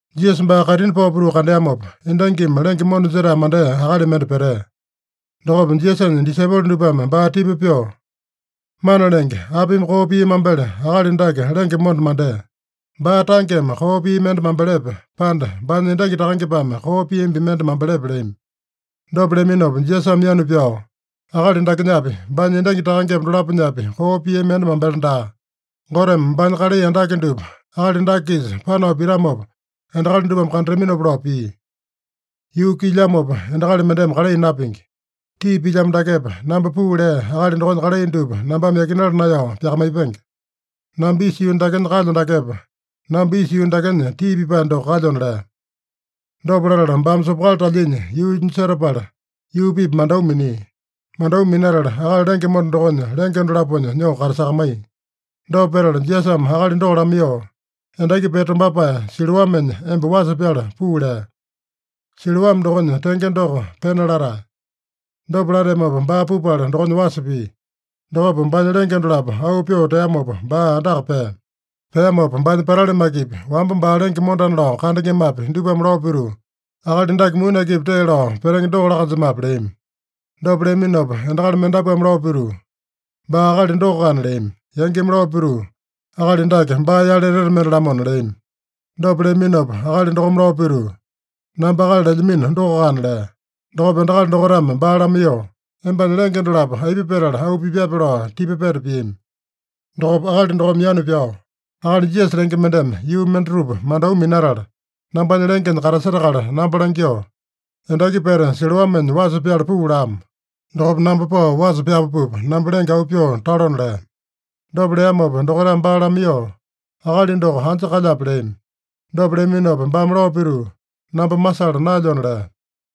Jisasa baa kaitini pao pituu kandeamopa, endangimi lenge monda jetae mandea akali mende petea. Dokopa Jisasanya disaipolo dupame baa tipa pyoo, “Mana Lenge, apimi koo pia mambele akali dake lenge monda mandea? Baa tangeme koo pia mende mambelepe, pande baanya endangi takangepame koo piambi mende mambelepe?” leami. Dopa leaminopa Jisasame yanu pyao, “Akali dakenyapi, baanya endangi takangepa dolaponyapi koo piami mende mambele daa. Goteme baanya kalai andake dupa akali dake-kisa panao pitamopa endakali dupame kandataminopa lao pia. Yuu kuilyamopa endakali mendeme kalai napingi. Tii pilyamo dakepa, namba puu lea Akali dokonya kalai dupa nambame yakinala naeyao pyakamaipenge. Namba isa yuu dakenya kalyo dakepa, namba isa yuu dakenya tii pipae doko kalyona” lea. Dopa latala baame sopokali talyinya yuunya setapala, yuu-pipa mandau minia. Mandau minatala akali lenge monda dokonya lenge dolaponya nyoo katasakamaiya. Dopa petala Jisasame akali doko lamaiyoo, “Endaki pete tombapae Siloamenya emba wasa pyala puu” lea. (Siloame dokonya tenge doko, Pena latae.) Dopa lateamopa, baa pupala dokonya wasa pia. Dokopa baanya lenge dolapo auu pyoo teamopa, baa andaka pea. Peamopa baanya patali makepi, wamba baa lenge mondana lao kandengemapi, dupame lao pituu, “Akali dake muni akipi tee lao petenge doko laa-kanjemape?” leami. Dopa leaminopa endakali mendapuame lao pituu, “Baa akali dokoakana” leami. Yangimi lao pituu, “Akali dake baa-yale etete mende-lamona” leami. Dopa leaminopa akali dokome lao pituu, “Namba akali lelyamino dokoakana” lea. Dokopa endakali dokaitame baa lamaiyoo, “Embanya lenge dolapo aipa petala auu pipyape?” lao tipa peta piami. Dokopa akali dokome yanu pyao, “Akali Jisasa lenge mendeme yuu mendatupa mandau minatala, nambanya lengenya katasetakala namba langyoo, ‘Endaki pete Siloamenya wasa pyala puu’ lamo. Dokopa namba pao wasa pyapapupa, namba lenge auu pyoo talona” lea. Dopa leamopa dokaitame baa lamaiyoo, “Akali doko anja kalyape?” leami. Dopa leaminopa baame lao pituu, “Namba masala naelyona” lea.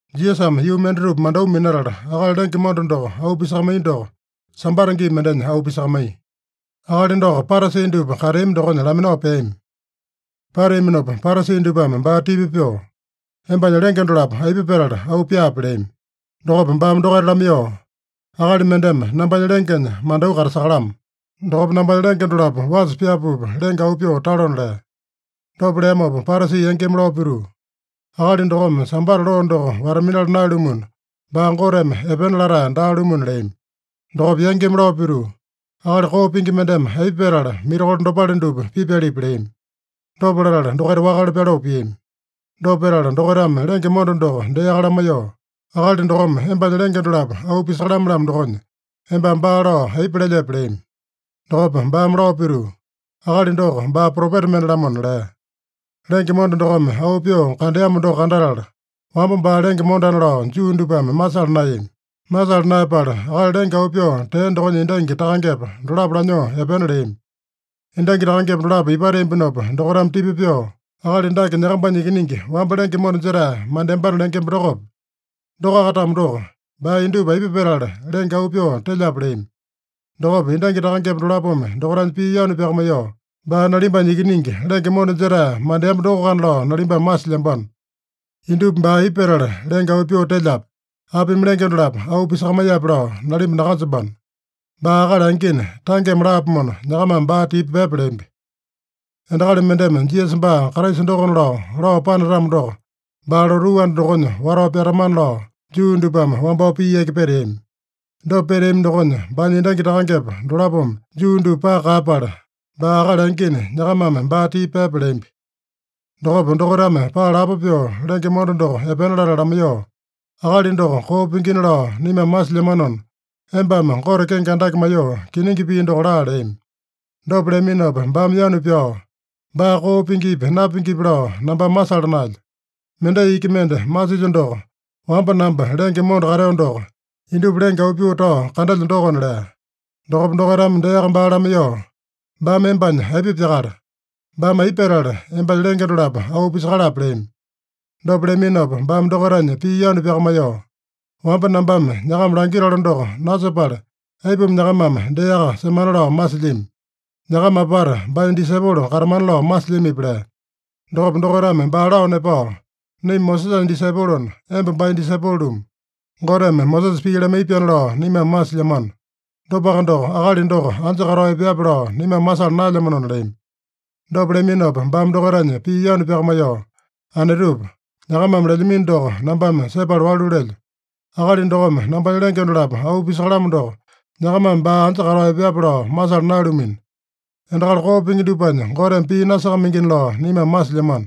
Jisasame yuu mendatupa mandau minatala, akali lenge monda doko auu pisakamaiya doko, Sambata gii mendenya auu pisakamaiya. Akali doko Parasi dupa kateami dokonya laminao peami. Pateaminopa Parasi dupame baa tipa pyoo, “Embanya lenge dolapo aipa petala auu pyaape?” leami. Dokopa baame dokaita lamaiyoo, “Akali mendeme nambanya lengenya mandau katasakalamo. Dokopa nambanya lenge dolapo wasa pyapapupa lenge auu pyoo talona” lea. Dopa leamopa Parasi yangimi lao pituu, “Akali dokome Sambata loo doko wata-minala naeyalumuna, baa Goteme epena latae daa-lumuna” leami. Dokopa yangimi lao pituu, “Akali koo pingi mendeme aipa petala mirakolo dopale dupa pipyalipi?” leami. Dopa latala dokaita wakale pyaloo piami. Dopa petala dokaitame lenge monda doko deaka lamaiyoo, “Akali dokome embanya lenge dolapo auu pisakalame-lamo dokonya, embame baa lao aipa lelyepe?” leami. Dokopa baame lao pituu, “Akali doko baa propeta mende-lamona” lea. Lenge monda dokome auu pyoo kandeamo doko kandatala, wamba baa lenge mondana lao Juu dupame masala naeyami. Masala naeyapala, akali lenge auu pyoo tea dokonya endangi takangepa dolapo lanyoo epena leami. Endangi takangepa dolapo ipateambinopa dokaitame tipa pyoo, “Akali dake nyakambanya ikiningi, wamba lenge monda jetae mandeambana lengemba dokope? Dokoaka-tamo doko, baa indupa aipa petala lenge auu pyoo telyape?” leami. Dokopa endangi takangepa dolapome dokaitanya pii yanu pyakamaiyoo, “Baa nalimbanya ikiningi, lenge monda jetae mandeamba dokoakana lao nalimbame masilyambano. Indupa baa aipa petala lenge auu pyoo telyape, apimi lenge dolapo auu pisakamaiyape lao nalimba nakanjembano. Baa akali angina, tangeme laapomona, nyakamame baa tipa pyepa” leambi. (Endakali mendeme Jisasa baa Kraisa dokona lao, lao panatamo doko, baa lotuu anda dokonya watao pyatamana lao, Juu dupame wambao pii yaki peteami. Dopa peteami dokonya baanya endangi takangepa dolapome Juu dupa paka kaeyapala, “Baa akali angina, nyakamame baa tipa pyepa” leambi.) Dokopa dokaitame paa lapo pyoo lenge monda doko epena latala lamaiyoo, “Akali doko koo pingina lao naimame masilyamanona, embame Gote kenge andake maiyoo kiningi pii doko laa” leami. Dopa leaminopa baame yanu pyao, “Baa koo pingipi, napingipi lao nambame masala naelyo. Mendai iki mende masilyo doko, wamba namba lenge monda kateo doko, indupa lenge auu pyoo tao kandelyo dokona” lea. Dokopa dokaitame deaka baa lamaiyoo, “Baame embanya aipa pyakala? Baame aipa petala embanya lenge dolapo auu pisakalape?” leami. Dopa leaminopa baame dokaitanya pii yanu pyakamaiyoo, “Wamba nambame nyakama langitalo doko nasepala, aipuma nyakamame deaka semana lao masilyami? Nyakama apata baanya disaipolo katamana lao masilyamipi?” lea. Dokopa dokaitame baa lao nepao, “Naima Mosesanya disaipolona, emba baanya disaipolo-lumu. Goteme Mosesa pii lamaiya-pyaana lao naimame masilyamano. Dopaka doko, akali doko anja katao epeape lao naimame masala naelyamanona” leami. Dopa leaminopa baame dokaitanya pii yanu pyakamaiyoo, “Anetupa, nyakamame lelyamino doko nambame sepala walu lelyo. Akali dokome nambanya lenge dolapo auu pisakalamo doko, nyakamame baa anja katao epeape lao masala naeyalumino. Endakali koo pingi dupanya Goteme pii nasakamaingina lao naimame masilyamano.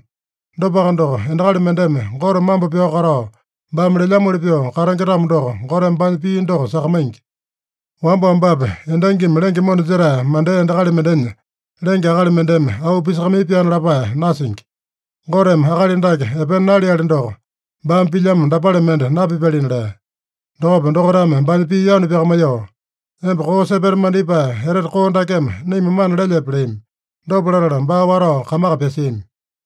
Dopaka doko, endakali mendeme Gote mambo pyao katao, baame lelyamoli pyoo katenge-tamo doko, Goteme baanya pii doko sakamaingi. Wamba-wambapi endangimi lenge monda jetae mandea endakali mendenya lenge akali mendeme auu pisakamaiya-pyaana lapae nasingi. Goteme akali dake epena naleali doko, baame pilyamo dapale mende napipyalina” lea. Dokopa dokaitame baanya pii yanu pyakamaiyoo, “Emba koo sepeta mandipae etete koo dakeme naima mana lelyepe?” leami. Dopa latala baa watao kamaka pyasiami.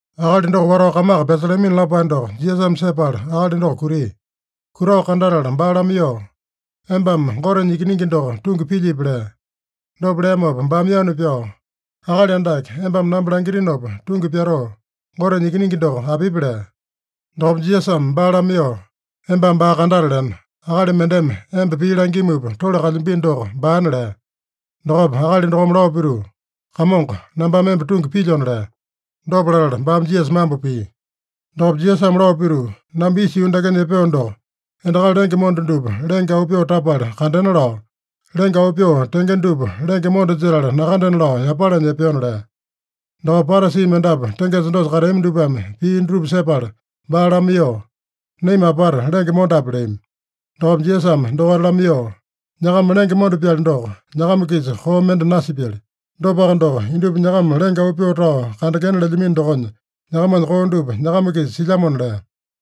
Akali doko watao kamaka pyasalamino lapae doko Jisasame sepala akali doko kutia. Kutao kandatala baa lamaiyoo, “Embame Gotenya Ikiningi doko tungi pilyipi?” lea. Dopa leamopa baame yanu pyao, “Akali Andake, embame namba langitinopa tungi pyatoo, Gotenya Ikiningi doko apipi?” lea. Dokopa Jisasame baa lamaiyoo, “Embame baa kandataleno. Akali mendeme emba pii langimupa tole kalyambino doko baana” lea. Dokopa akali dokome lao pituu, “Kamongo, nambame emba tungi pilyona” lea. Dopa latala baame Jisasa mambo pia. Dokopa Jisasame lao pituu, “Namba isa yuu dakenya epeo doko, endakali lenge monda dupa lenge auu pyoo tapala kandena lao, lenge auu pyoo tenge dupa lenge monda jetala nakandena lao yapalanya epeona” lea. Dokopa Parasi mendapu tengesa dosa kateami dupame pii dutupa sepala baa lamaiyoo, “Naima apata lenge mondape?” leami. Dokopa Jisasame dokaita lamaiyoo, “Nyakama lenge monda-pyali doko, nyakama-kisa koo mende nasipyali. Dopaka doko, indupa nyakama lenge auu pyoo tao kandengena lelyamino dokonya, nyakamanya koo dupa nyakama-kisa silyamona” lea.